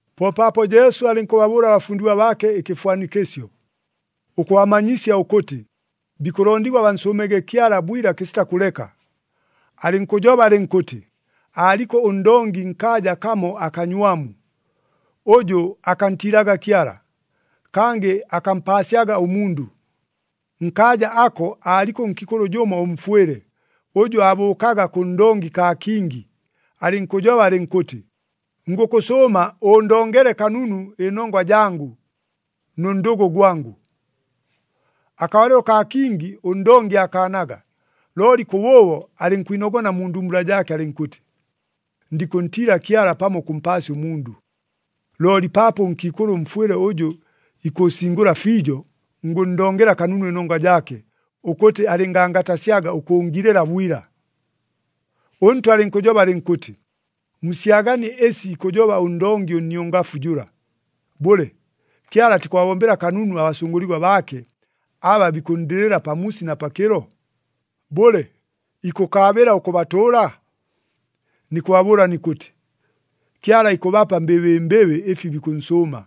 Po paapo Jesu alɨnkʉbabʉʉla abafundigwa baake ɨkɨfwanikɨsyo, ʉkʉbamanyisya ʉkʉtɨ, bikʉlondigwa bansʉʉmege Kyala bwila kɨsita kʉleka. Alɨnkʉjoba alɨnkʉtɨ, “Aaliko ʉndongi nkaaja kamo akanywamu, ʉjʉ akantiilaga Kyala, kangɨ akampaasyaga ʉmundʉ. Nkaaja ako aaliko ʉnkiikʉlʉ jʉmo ʉmfwɨle, ʉjʉ aabʉʉkaga kʉ ndongi kaa kingi, alɨnkʉjoba alɨnkʉtɨ, ‘Ngʉkʉsʉʉma ʉʉndongele kanunu ɨnongwa jangʉ nʉ ndʉgʉ gwangʉ.’ “Akabalɨlo kaa kingi ʉndongi aakaanaga, looli kʉbʉʉbo alɨnkwinogona mu ndumbula jaake alɨnkʉtɨ, ‘Ndikʉntiila Kyala pamo ʉkʉmpaasya ʉmundʉ. Looli paapo ʉnkiikʉlʉ ʉmfwɨle ʉjʉ ikʉʉsingʉla fiijo, ngʉnndongela kanunu ɨnongwa jaake, ʉkʉtɨ alɨngangatasyaga ʉkʉʉngilɨla bwila!’” ɄNtwa alɨnkʉjoba alɨnkʉtɨ, “Musyaganie ɨsi ikʉjoba ʉndongi ʉnniongafu jʉla! Bʉle, Kyala atikʉbabombela kanunu abasʉngʉligwa baake, aba bikʉnndɨlɨla pamuusi na pakɨlo? Bʉle, ikʉkaabɨla ʉkʉbatʉʉla? Nikʉbabʉʉla nikʉtɨ, Kyala ikʉbapa mbɨbɨmbɨbɨ ɨfi bikʉnsʉʉma.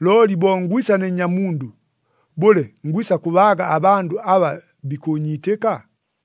Looli bo ngwisa ne Nnyamundʉ, bʉle, ngwisa kʉbaaga abandʉ aba bikʉʉnyiitɨka?”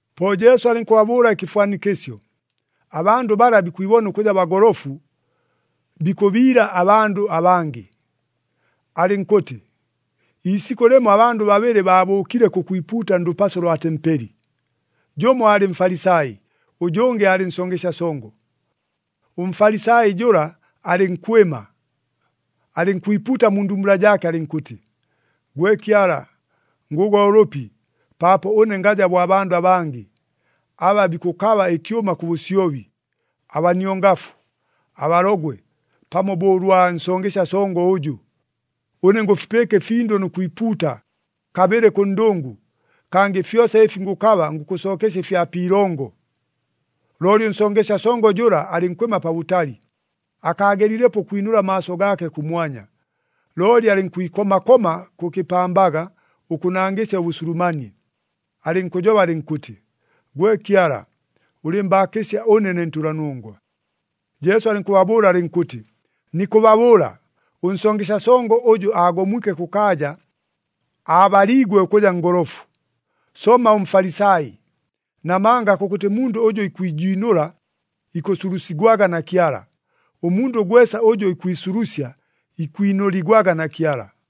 Po Jesu alɨnkʉbabʉʉla ɨkɨfwanikɨsyo, abandʉ bala bikwibona ʉkʉja bagolofu, bikʉbiila abandʉ abangɨ. Alɨnkʉtɨ, “Iisikʉ lɨmo abandʉ babɨlɨ baabʉʉkile kʉkwipuuta ndʉpaso lwa tempeli, jʉmo aalɨ Mfalisai, ʉjʉngɨ aalɨ nsongesya songo. ɄMfalisai jʉla alɨnkwɨma, alɨnkwipuuta mu ndumbula jaake alɨnkʉtɨ, ‘Gwe Kyala, ngʉgwa ʉlʉpi, paapo ʉne ngaja bo abandʉ abangɨ, aba bikʉkaba ɨkyʉma kʉ bʉsyobi, abaniongafu, abalogwe, pamo bo ʉlwa nsongesya songo ʉjʉ! Ʉne ngʉfipɨɨka ɨfindʉ nʉ kwipuuta, kabɨlɨ kʉ ndʉngʉ, kangɨ fyosa ɨfi ngʉkaba ngʉkʉsookesya ɨfya pi ilongo.’ Looli ʉnsongesya songo jʉla, alɨnkwɨma pabʉtali, akaagelilepo ʉkwinʉla amaaso gaake kʉmwanya, looli alɨnkwikoma koma kʉ kɨpambaga ʉkʉnangɨsya ʉbʉsulumanie, alɨnkʉjoba alɨnkʉtɨ, ‘Gwe Kyala, ʉlɨɨmbaakɨsya ʉne, ne ntʉlanongwa!’” Jesu alɨnkʉbabʉʉla alɨnkʉtɨ, “Nikʉbabʉʉla, ʉnsongesya songo ʉjʉ aagomwike kʉkaaja, aabaliigwe ʉkʉja ngolofu, somma ʉMfalisai. Namanga kʉkʉtɨ mundʉ ʉjʉ ikwijiinʉla, ikʉsulusigwaga na Kyala, ʉmundʉ gwesa ʉjʉ ikwisulusya ikwinʉligwaga na Kyala.”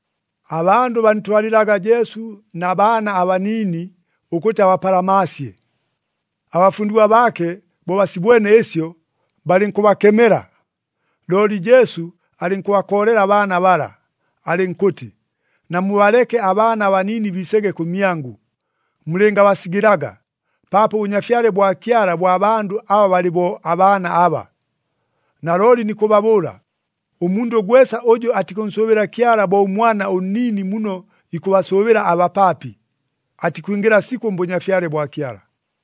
Abandʉ bantwalɨlaga Jesu na baana abaniini, ʉkʉtɨ abapalamaasye. Abafundigwa baake bo basibwene ɨsyo, balɨnkʉbakemela. Looli Jesu alɨnkʉbakoolela abaana bala, alɨnkʉtɨ, “Namubaleke abaana abaniini biisege kʉmyangʉ, mulɨngabasigɨlaga, paapo ʉBʉnyafyale bwa Kyala bwa bandʉ aba balɨ bo abaana aba. Nalooli nikʉbabʉʉla, ʉmundʉ gwesa ʉjʉ atikʉnsʉʉbɨla Kyala bo ʉmwana ʉnniini muno ikʉbasʉʉbɨla abapaapi, atikwingɨla sikʉ mBʉnyafyale bwa Kyala.”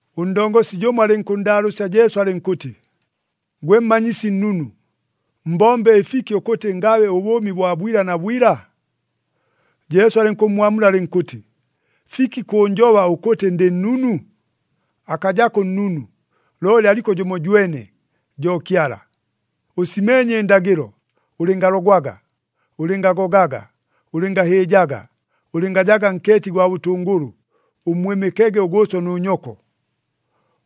Ʉndongosi jʉmo alɨnkʉnndaalʉʉsya Jesu alɨnkʉtɨ, “Gwe Mmanyisi Nnunu, mbombe ɨfiki ʉkʉtɨ ngabe ʉbʉʉmi bwa bwila na bwila?” Jesu alɨnkʉmmwamula alɨnkʉtɨ, “Fiki kʉʉnjoba ʉkʉtɨ ndɨ nnunu? Akajako ʉnnunu, looli aliko jʉmojwene, jo Kyala! Ʉsimeenye ɨndagɨlo, ‘Ʉlɨngalogwaga, ʉlɨngagogaga, ʉlɨngahɨɨjaga, ʉlɨngajaga nkeeti gwa bʉtʉngʉlʉ, ʉmmwɨmɨkege ʉgʉʉso nʉ nyoko.’”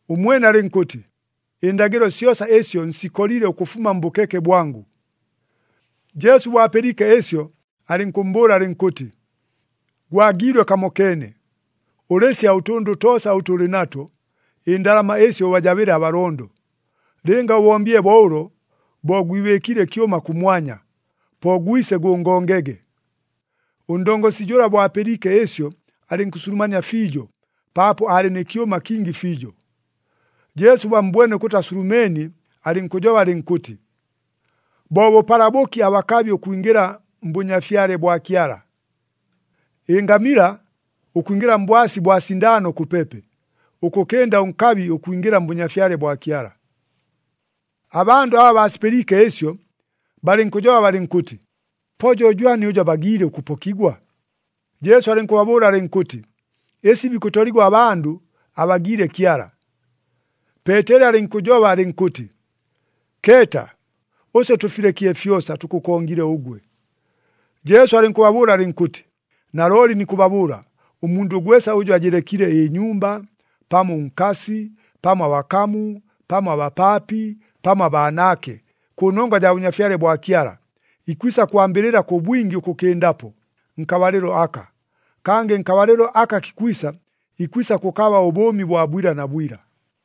Ʉmwene alɨnkʉtɨ, “Ɨndagɨlo syosa ɨsyo nsikolile ʉkʉfuma mbʉkeke bwangʉ.” Jesu bo apɨliike ɨsyo, alɨnkʉmmbʉʉla alɨnkʉtɨ, “Gwagiilwe kamokeene. Ʉlɨsya ʉtʉndʉ toosa ʉtʉ ʉlɨ nato, ɨndalama ɨsyo ʉbajabɨle abalondo. Lɨnga ʉbombile bo ʉlo, bo gwibɨɨkiile ɨkyʉma kʉmwanya. Po gwise gʉngongege.” Ʉndongosi jʉla bo apɨliike ɨsyo, alɨnkʉsulumania fiijo, paapo aalɨ nɨ kyʉma kingi fiijo. Jesu bo ammbwene ʉkʉtɨ asulumeenie, alɨnkʉjoba alɨnkʉtɨ, “Bo bʉpala bʉki abakabi ʉkwingɨla mBʉnyafyale bwa Kyala! Ɨngamila ʉkwingɨla mbwasi bwa sindaano kʉpepe, ʉkʉkɨnda ʉnkabi ʉkwingɨla mBʉnyafyale bwa Kyala!” Abandʉ aba baasipɨliike ɨsyo, balɨnkʉjoba balɨnkʉtɨ, “Po jo jwani ʉjʉ abagiile ʉkʉpokigwa?” Jesu alɨnkʉbabʉʉla alɨnkʉtɨ, “Ɨsi bikʉtoligwa abandʉ, abagiile Kyala.” Peeteli alɨnkʉjoba alɨnkʉtɨ, “Keeta, ʉswe tʉfilekile fyosa, tʉkʉkongile ʉgwe!” Jesu alɨnkʉbabʉʉla alɨnkʉtɨ, “Nalooli nikʉbabʉʉla, ʉmundʉ gwesa ʉjʉ ajɨlekile ɨnyumba, pamo ʉnkasi, pamo abakamu, pamo abapaapi, pamo abaanaake, kʉnongwa jaa Bʉnyafyale bwa Kyala, ikwisa kwambɨlɨla kʉ bwingi ʉkʉkɨndapo, nkabalɨlo aka. Kangɨ nkabalɨlo aka kikwisa, ikwisa kʉkaba ʉbʉʉmi bwa bwila na bwila.”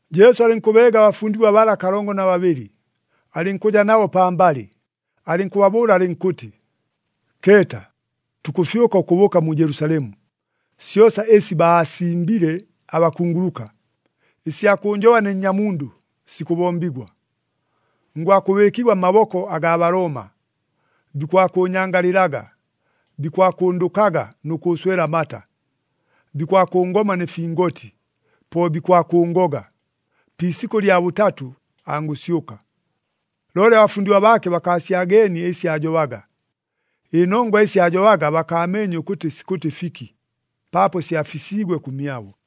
Jesu alɨnkʉbeega abafundigwa bala kalongo na babɨlɨ, alɨnkʉja nabo pambalɨ, alɨnkʉbabʉʉla alɨnkʉtɨ, “Keeta! Tukʉfyʉka ʉkʉbʉʉka mu Jelusalemu, syosa ɨsi baasimbile abakunguluka, ɨsya kʉʉnjoba ne Nnyamundʉ, sikʉbombigwa. Ngwakʉbɨɨkigwa mmaboko agaa Balooma. Bikwakʉʉnyangalɨlaga, bikwakʉndʉkaga nʉ kʉʉswela amata. Bikwakʉngoma nɨ fingoti, po bikwakʉʉngoga. Pi isikʉ lya bʉtatʉ, angʉsyʉka.” Looli abafundigwa baake bakaasyageenie ɨsi aajobaga. Ɨnongwa ɨsi aajobaga bakaameenye ʉkʉtɨ sikʉtɨ fiki, paapo syafisiigwe kʉmyabo.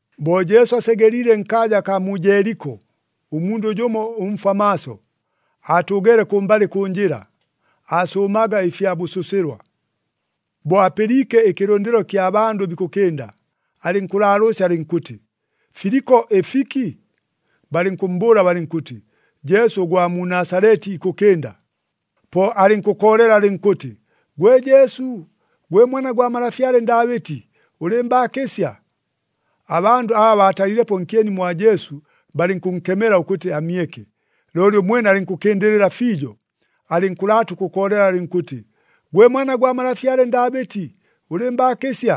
Bo Jesu asegeliile nkaaja akaa mu Jeeliko, ʉmundʉ jʉmo ʉmfwa maaso, aatʉʉgeele kʉmbalɨ kʉ njɨla, aasʉʉmaga ɨfya bʉsʉsɨlwa. Bo apɨliike ɨkɨlʉndɨlo kya bandʉ bikʉkɨnda, alɨnkʉlaalʉʉsya alɨnkʉtɨ, “Filiko ɨfiki?” Balɨnkʉmmbʉʉla balɨnkʉtɨ, “Jesu ʉgwa mu Nasaleti ikʉkɨnda.” Po alɨnkʉkoolela alɨnkʉtɨ, “Gwe Jesu, gwe Mwana gwa malafyale Ndaabɨti, ʉlɨɨmbaakɨsya!” Abandʉ aba baatalilepo nkyeni mwa Jesu, balɨnkʉnkemela ʉkʉtɨ amyeke. Looli ʉmwene alɨnkʉkɨndɨlɨla fiijo, alɨnkʉlaata ʉkʉkoolela alɨnkʉtɨ, “Gwe Mwana gwa malafyale Ndaabɨti, ʉlɨɨmbaakɨsya!”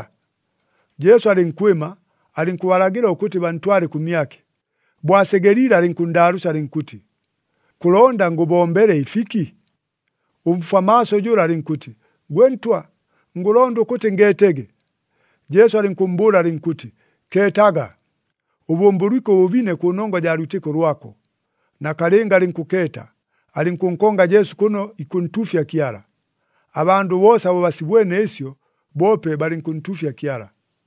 Jesu alɨnkwɨma, alɨnkʉbalagɨla ʉkʉtɨ bantwale kʉmyake. Bo asegeliile alɨnkʉnndaalʉʉsya alɨnkʉtɨ, “Kʉlonda ngʉbombele ɨfiki?” Ʉmfwa maaso jʉla alɨnkʉtɨ, “Gwe Ntwa, ngʉlonda ʉkʉtɨ ngeetege.” Jesu alɨnkʉmmbʉʉla alɨnkʉtɨ, “Keetaga! Ʉbʉmbʉlwike ʉbʉbine kʉnongwa jaa lwitɨko lwako.” Nakalɨnga alɨnkʉkeeta, alɨnkʉnkonga Jesu kʉno ikʉntuufya Kyala. Abandʉ boosa bo basibwene ɨsyo, boope balɨnkʉntuufya Kyala.